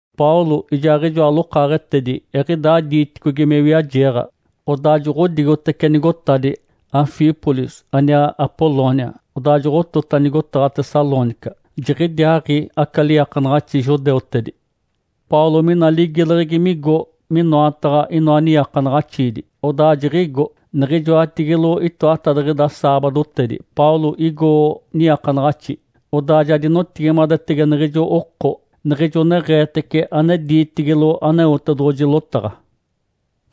Paulo ijaaɡ̶ijoa lokaaɡ̶etedi eɡ̶idaa diiticogi me wiajeeɡ̶a, odaa joɡ̶odigotece nigotadi Anfípolis aniaa Apolônia, odaa joɡ̶otota nigotaɡ̶a Tessalônica. Jiɡ̶idiaaɡ̶i aca liiakanaɡ̶axi judeutedi. Paulo mina ligileɡ̶egi migo minoataɡ̶a inoa niiakanaɡ̶axiidi, odaa jiɡ̶igo. Niɡ̶ijoatigilo itoatadiɡ̶ida saabadotedi Paulo igo niiakanaɡ̶axi, odaa ja dinotigimadetege niɡ̶ijo oko niɡ̶ijo neɡ̶eetece ane diitigilo Aneotedoɡ̶oji lotaɡ̶a.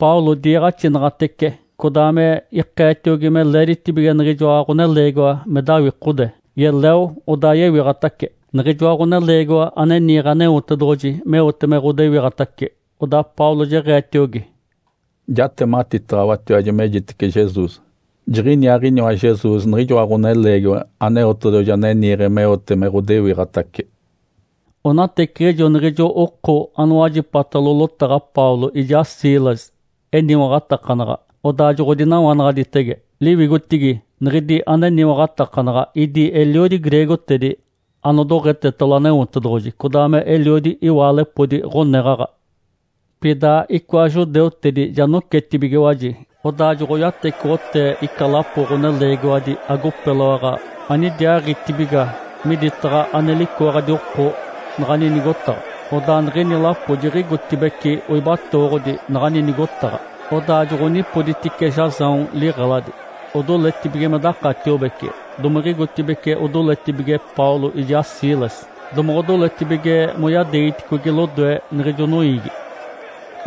Paulo diiɡ̶axinaɡ̶atece codaa me ikeetiogi me leeditibige niɡ̶ijoa ɡ̶oneleegiwa me dawikode, yeleo, odaa yewiɡ̶atace, niɡ̶ijoa ɡ̶oneleegiwa ane niiɡ̶e Aneotedoɡ̶oji meote me ɡ̶odewiɡ̶atace. Odaa Paulo jeɡ̶eetiogi, “Jatematitaɡ̶awatiwaji, mejitece Jesus. Jiɡ̶iniaaɡ̶iniwa Jesus niɡ̶ijoa ɡ̶oneleegiwa Aneotedoɡ̶oji ane niiɡ̶e meote me ɡ̶odewiɡ̶atace.” Onateciɡ̶ijo niɡ̶ijo oko anowajipatalo lotaɡ̶a Paulo ijaa Silas eniwaɡ̶atakanaɡ̶a, odaa joɡ̶odinawanaɡ̶aditege. Liwigotigi niɡ̶idi aneniwaɡ̶atakanaɡ̶a idi eliodi greegotedi anodoɡ̶etetalo Aneotedoɡ̶oji, codaa meliodi iwaalepodi ɡ̶oneɡ̶aɡ̶a. Pida icoa judeutedi ja nocetibigiwaji, odaa joɡ̶oyatecoɡ̶otee ica lapo ɡ̶oneleegiwadi agopeloaɡ̶a anidiaaɡ̶itibiga miditaɡ̶a ane licooɡ̶adi oko naɡ̶ani nigotaɡ̶a. Odaa niɡ̶ini lapo jiɡ̶igotibeci oibatooɡ̶odi naɡ̶ani nigotaɡ̶a. Odaa joɡ̶onipoditice Jasão liɡ̶eladi, odoletibige me dakatiobece, domiɡ̶igotibeci odoletibige Paulo ijaa Silas, domoɡ̶odoletibige moyadeegiticogi lodoe niɡ̶ijo noiigi.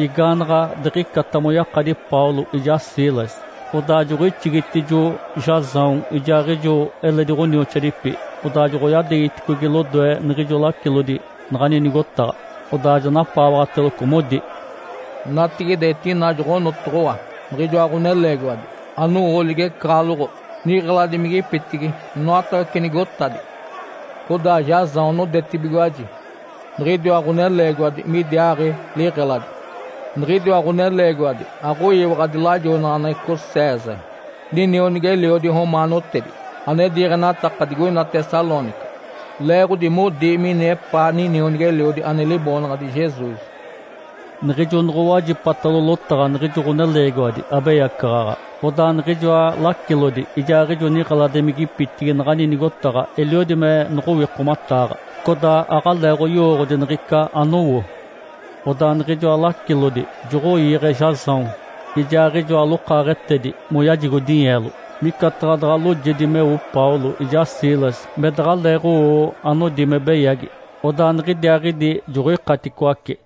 Igaanaɡ̶a diɡ̶icata moyakadi Paulo ijaa Silas, odaa joɡ̶oixigitijo Jasão ijaaɡ̶ijo eledi ɡ̶onioxoadipi, odaa joɡ̶oyadeegiticogi lodoe niɡ̶ijoa lacilodi naɡ̶ani nigotaɡ̶a. Odaa ja napaawaɡ̶ateloco, modi, “Natigide etina joɡ̶onotoɡ̶owa niɡ̶ijoa ɡ̶oneleegiwadi anowo ligecaɡ̶aloɡ̶o niɡ̶eladimigipitigi inoatawece nigotadi. Codaa Jasão nodetibigiwaji niɡ̶idiwa ɡ̶oneleegiwadi midiaaɡ̶i liɡ̶eladi. Niɡ̶idiwa ɡ̶oneleegiwadi aɡ̶oyiwaɡ̶adi lajoinaɡ̶aneɡ̶eco César, ninionigi-eliodi romaanotedi ane diiɡ̶enataka digoina Tessalônica, leeɡ̶odi modi mini epaa ninionigi-eliodi ane liboonaɡ̶adi Jesus.” Niɡ̶ijo noɡ̶owajipatalo lotaɡ̶a niɡ̶ijo ɡ̶oneleegiwadi abeyacaɡ̶aɡ̶a, odaa niɡ̶ijoa lacilodi ijaaɡ̶ijo niɡ̶eladimigipitigi naɡ̶ani nigotaɡ̶a eliodi me noɡ̶owikomataaɡ̶a, codaa aɡ̶aleeɡ̶oyowooɡ̶odi niɡ̶ica anowo. Odaa niɡ̶ijoa lacilodi joɡ̶oiiɡ̶e Jasão ijaaɡ̶ijoa lokaaɡ̶etedi moyajigo dinyeelo, micataɡ̶a daɡ̶a loojedi meo Paulo ijaa Silas me daɡ̶aleeɡ̶owo anodi me beyagi. Odaa niɡ̶idiaaɡ̶idi joɡ̶oikaticoace.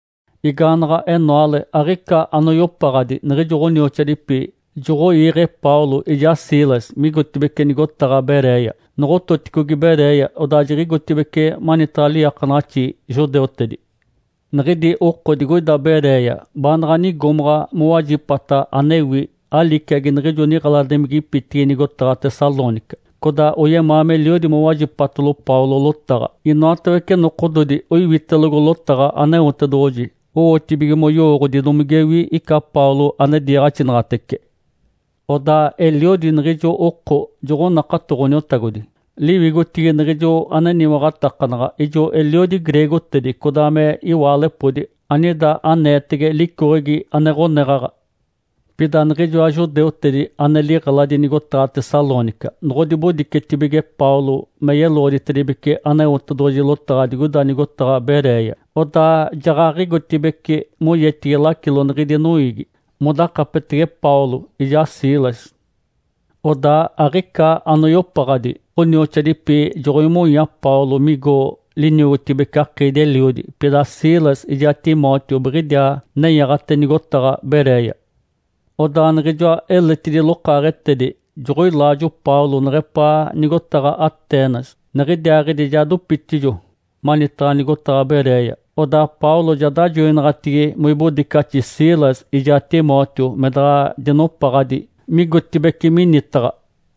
Igaanaɡ̶a enoale, aɡ̶ica anoyopaɡ̶adi niɡ̶ijo ɡ̶onioxoadipi joɡ̶oiiɡ̶e Paulo ijaa Silas migotibeci nigotaɡ̶a Beréia. Noɡ̶ototicogi Beréia, odaa jiɡ̶igotibeci manitaɡ̶a liiakanaɡ̶axi judeutedi. Niɡ̶idi oko digoida Beréia baanaɡ̶a nigomaɡ̶a mowajipata anewi aliciagi niɡ̶ijo niɡ̶eladimigipitigi nigotaɡ̶a Tessalônica. Codaa oyemaa meliodi mowajipatalo Paulo lotaɡ̶a. Inoatawece nokododi oiwitelogo lotaɡ̶a Aneotedoɡ̶oji owotibige moyowooɡ̶odi domigewi ica Paulo ane diiɡ̶axinaɡ̶atece. Odaa eliodi niɡ̶ijo oko joɡ̶onakato Ǥoniotagodi. Liwigotigi niɡ̶ijo aneniwaɡ̶atakanaɡ̶a ijo eliodi greegotedi codaa me iwaalepodi anida aneetege licoɡ̶egi ane ɡ̶oneɡ̶aɡ̶a. Pida niɡ̶ijoa judeutedi ane liɡ̶eladi nigotaɡ̶a Tessalônica noɡ̶odibodicetibige Paulo me yeloɡ̶oditedibece Aneotedoɡ̶oji lotaɡ̶a digoida nigotaɡ̶a Beréia, odaa jaɡ̶aɡ̶igotibeci moyetigi lacilo niɡ̶idi noiigi modakapetege Paulo ijaa Silas. Odaa aɡ̶ica anoyopaɡ̶adi ɡ̶onioxoadipi joɡ̶oimonya Paulo migo liniogotibece akiidi-eliodi, pida Silas ijaa Timóteo biɡ̶idiaa nenyaɡ̶ate nigotaɡ̶a Beréia. Odaa niɡ̶ijoa eletidi lokaaɡ̶etedi joɡ̶oilaajo Paulo neɡ̶epaa nigotaɡ̶a Atenas. Niɡ̶idiaaɡ̶idi ja dopitijo manitaɡ̶a nigotaɡ̶a Beréia, odaa Paulo ja dajoinaɡ̶atigi moibodicaxi Silas ijaa Timóteo me daɡ̶a dinopaɡ̶adi migotibeci minitaɡ̶a.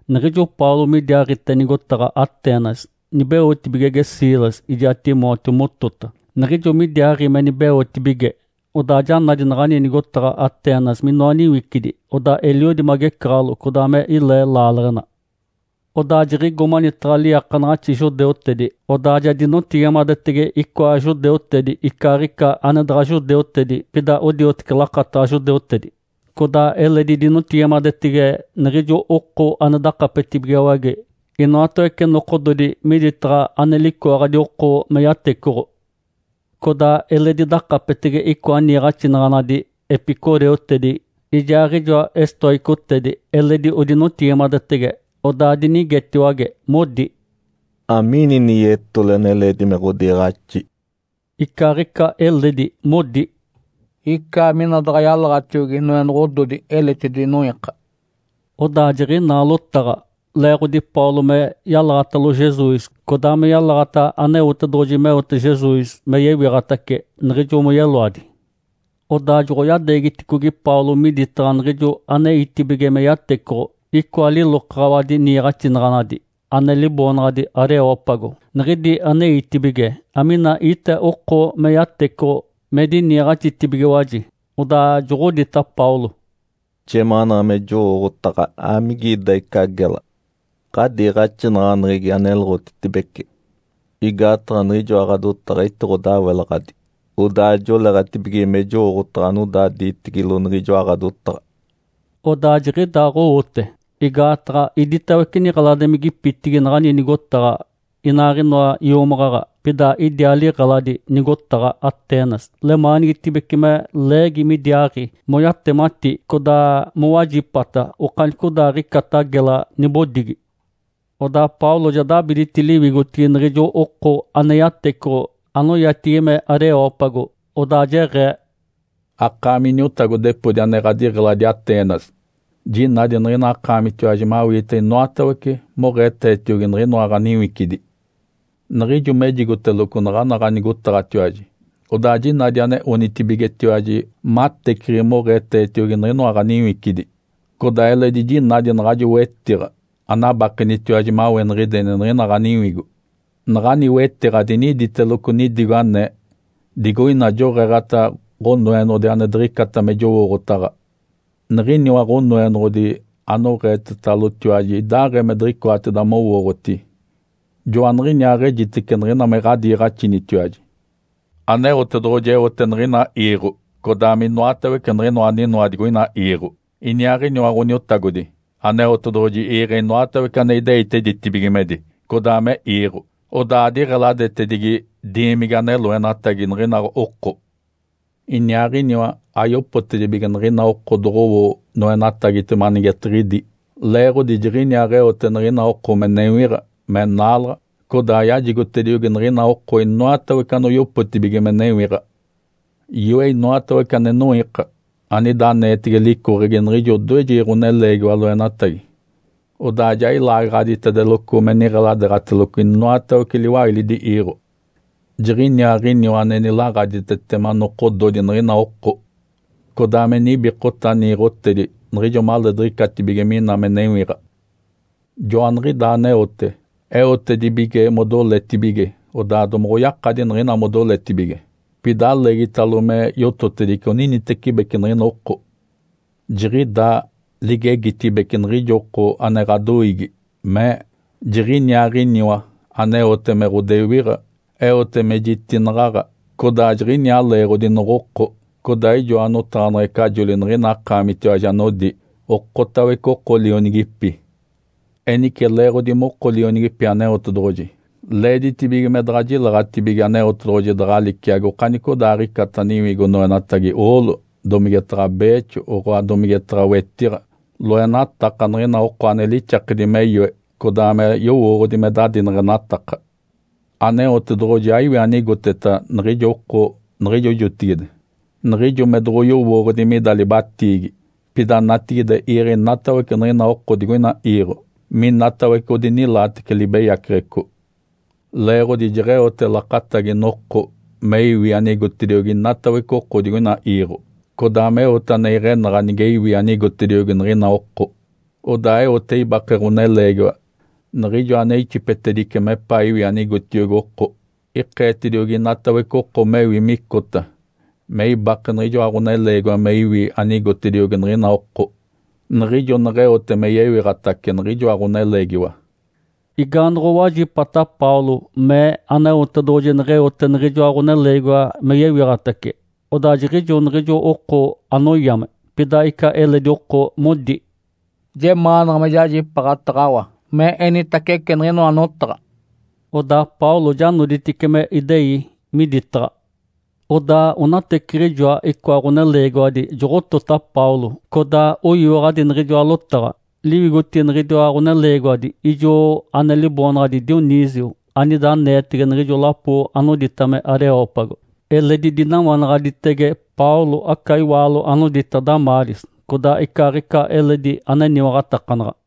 Niɡ̶ijo Paulo midiaaɡ̶ite nigotaɡ̶a Atenas, nibeotibigege Silas ijaa Timóteo motota. Niɡ̶ijo midiaaɡ̶i me nibeotibige, odaa ja nadi naɡ̶ani nigotaɡ̶a Atenas minoa niwicidi. Odaa eliodi me agecaɡ̶alo, codaa me ilee laaleɡ̶ena. Odaa jiɡ̶igo manitaɡ̶a liiakanaɡ̶axi judeutedi, odaa ja dinotigimadetege icoa judeutedi icaaɡ̶ica ane daɡ̶a judeutedi pida odioteci lakataɡ̶a judeutedi, codaa eledi dinotigimadetege niɡ̶ijo oko ane dakapetibigiwage inoatawece nokododi miditaɡ̶a ane licooɡ̶adi oko me yatecoɡ̶o. Codaa eledi dakapetege icoa niiɡ̶axinaɡ̶anadi epicureutedi ijaaɡ̶ijoa estóicotedi, eledi odinotigimadetege. Odaa dinigetiwage, modi, “Amiini ini yetole ane leedi me ɡ̶odiiɡ̶axi?” Icaaɡ̶ica eledi modi, “Icaa mina daɡ̶a yalaɡ̶atiogi noenoɡ̶ododi eletidi noiika.” Odaa jiɡ̶inaa lotaɡ̶a leeɡ̶odi Paulo me yalaɡ̶atalo Jesus codaa me yalaɡ̶ata Aneotedoɡ̶oji meote Jesus me yewiɡ̶atace niɡ̶ijo moyeloadi. Odaa joɡ̶oyadeegiticogi Paulo miditaɡ̶a niɡ̶ijo aneitibige me yatecoɡ̶o icoa lilokaɡ̶awadi niiɡ̶axinaɡ̶anadi, ane liboonaɡ̶adi Areópago, niɡ̶idi aneitibige amina ite oko me yatecoɡ̶o, me diniiɡ̶axitibigiwaji. Odaa joɡ̶odita Paulo, “Jemaanaɡ̶a me jowooɡ̶otaɡ̶a amigida ica gela ɡ̶adiiɡ̶axinaɡ̶aneɡ̶egi aneloɡ̶otitibece. Igaataɡ̶a niɡ̶ijoa ɡ̶adotaɡ̶a etiɡ̶odawelaɡ̶adi, odaa joleeɡ̶atibige me jowooɡ̶otaɡ̶a anodaa diitigilo niɡ̶ijoa ɡ̶adotaɡ̶a.” Odaa jiɡ̶idaaɡ̶owote, igaataɡ̶a iditawece niɡ̶eladimigipitigi naɡ̶ani nigotaɡ̶a inaaɡ̶inoa iomaɡ̶aɡ̶a pida idiaa liɡ̶eladi nigotaɡ̶a Atenas lemaanigitibece me leegi midiaaɡ̶i moyatemati codaa mowajipata okanicodaaɡ̶icata gela nibodigi. Odaa Paulo ja dabiditi liwigotigi niɡ̶ijo oko ane yatecoɡ̶o anoyatigi me Areópago, odaa jeɡ̶ee, “Akaami iniotagodepodi ane ɡ̶adiɡ̶eladi Atenas jinadi niɡ̶ina akaamitiwaji mawiite inoatawece moɡ̶eetetiogi niɡ̶inoa ɡ̶aniwicidi. Niɡ̶ijo mejigoteloco naɡ̶ana ɡ̶anigotaɡ̶atiwaji, odaa jinadi ane onitibigetiwaji mateciɡ̶i moɡ̶eetetiogi niɡ̶inoa ɡ̶aniwicidi. Codaa eledi jinadi naɡ̶ajo wetiɡ̶a anabakenitiwaji maweniɡ̶ideni niɡ̶ina ɡ̶aniwigo, naɡ̶ani wetiɡ̶a diniditeloco nidigo anee, ‘Digoina joɡ̶eeɡ̶ata ɡ̶onoenoɡ̶odi ane diɡ̶icata me jowooɡ̶otaɡ̶a.’ Niɡ̶iniwa Ǥonoenoɡ̶odi anoɡ̶eetetalotiwaji idaaɡ̶ee me diɡ̶icoatedi mowooɡ̶oti, joaniɡ̶iniaaɡ̶ejitece niɡ̶ina me ɡ̶adiiɡ̶axinitiwaji. Aneotedoɡ̶oji eote niɡ̶ina iiɡ̶o codaa me inoatawece niɡ̶inoa aninoa digoina iiɡ̶o. Iniaaɡ̶iniwa Ǥoniotagodi Aneotedoɡ̶oji iiɡ̶e inoatawece ane ideite ditibigimedi codaa me iiɡ̶o, odaa adiɡ̶eladetedigi diimigi ane loenatagi niɡ̶ina oko. Iniaaɡ̶iniwa ayopotedibige niɡ̶ina oko doɡ̶owo noenatagitema anigetiɡ̶idi, leeɡ̶odi Jiɡ̶iniaaɡ̶eote niɡ̶ina oko me newiɡ̶a, me naalaɡ̶a, codaa yajigotediogi niɡ̶ina oko inoatawece anoyopotibige me newiɡ̶a. Yoe inoatawece ane noiika, anida aneetege licoɡ̶egi niɡ̶ijo odoejegi ɡ̶oneleegiwa loenatagi. Odaa ja ilaagaɡ̶aditedeloco me niɡ̶eladeeɡ̶ateloco inoatawece liwailidi iiɡ̶o. Jiɡ̶iniaaɡ̶iniwa ane nilaɡ̶aditetema nokododi niɡ̶ina oko, codaa me nibikota niiɡ̶otedi niɡ̶ijo maleediɡ̶icatibige mina me newiɡ̶a. Joaniɡ̶idaa aneote, eotedibige modoletibige odaa domoɡ̶oyakadi niɡ̶ina modoletibige. Pida aleegitalo me yototedice oninitecibeci niɡ̶ina oko. Jiɡ̶idaa ligegitibece niɡ̶ijo oko ane ɡ̶adoiigi mee, ‘Jiɡ̶iniaaɡ̶iniwa aneote me ɡ̶odewiɡ̶a, eote me jitinaɡ̶aɡ̶a, codaa jiɡ̶iniaa leeɡ̶odi noɡ̶oko.’ Codaa ijoa notaɡ̶aneɡ̶ecajoli niɡ̶ina akaamitiwaji anodi, ‘Okotawece oko lionigipi.’ Enice leeɡ̶odi moko lionigipi Aneotedoɡ̶oji leeditibige me daɡ̶a jileɡ̶atibige Aneotedoɡ̶oji daɡ̶a liciagi okanicodaaɡ̶icata niwigo noenatagi oolo, domigetaɡ̶a beexo, oɡ̶oa domigetaɡ̶a wetiɡ̶a, loenataka niɡ̶ina oko ane lixakedi me yoe, codaa me yowooɡ̶odi me dadineɡ̶enataka. Aneotedoɡ̶oji aiwi anigoteta niɡ̶ijo oko niɡ̶ijo jotigide niɡ̶ijo me doɡ̶oyowooɡ̶odi mida libatiigi. Pida natigide iiɡ̶e inatawece niɡ̶ina oko digoina iiɡ̶o, minatawece odinilaatece libeyaceɡ̶eco. Leeɡ̶odi jeɡ̶eote lakatagi noko me iwi anigotediogi inatawece oko digoina iiɡ̶o, codaa meote ane iɡ̶enaɡ̶a nige iwi anigotediogi niɡ̶ina oko. Odaa eote ibake Ǥoneleegiwa niɡ̶ijo ane ixipetedice mepaa iwi anigotiogi oko. Ikeetediogi inatawece oko mewi micota me ibake niɡ̶ijoa Ǥoneleegiwa me iwi anigotediogi niɡ̶ina oko, niɡ̶ijo neɡ̶eote me yewiɡ̶atace niɡ̶ijoa Ǥoneleegiwa.” Igaanoɡ̶owajipata Paulo mee Aneotedoɡ̶oji neɡ̶eote niɡ̶ijoa Ǥoneleegiwa me yewiɡ̶atace, odaa jiɡ̶ijo niɡ̶ijo oko anoyame. Pida ica eledi oko modi, “Jemaanaɡ̶a me jajipaaɡ̶ataɡ̶awa me enitacece niɡ̶inoa notaɡ̶a.” Odaa Paulo ja noditice me idei miditaɡ̶a. Odaa onateciɡ̶ijoa icoa ɡ̶oneleegiwadi joɡ̶otota Paulo, codaa oyiwaɡ̶adi niɡ̶ijoa lotaɡ̶a. Liwigotigi niɡ̶idiwa ɡ̶oneleegiwadi, ijo ane liboonaɡ̶adi Dionísio anida aneetege niɡ̶ijo lapo anodita me Areópago. Eledi dinawanaɡ̶aditege Paulo aca iwaalo anodita Damáris, codaa icaaɡ̶ica eledi aneniwaɡ̶atakanaɡ̶a.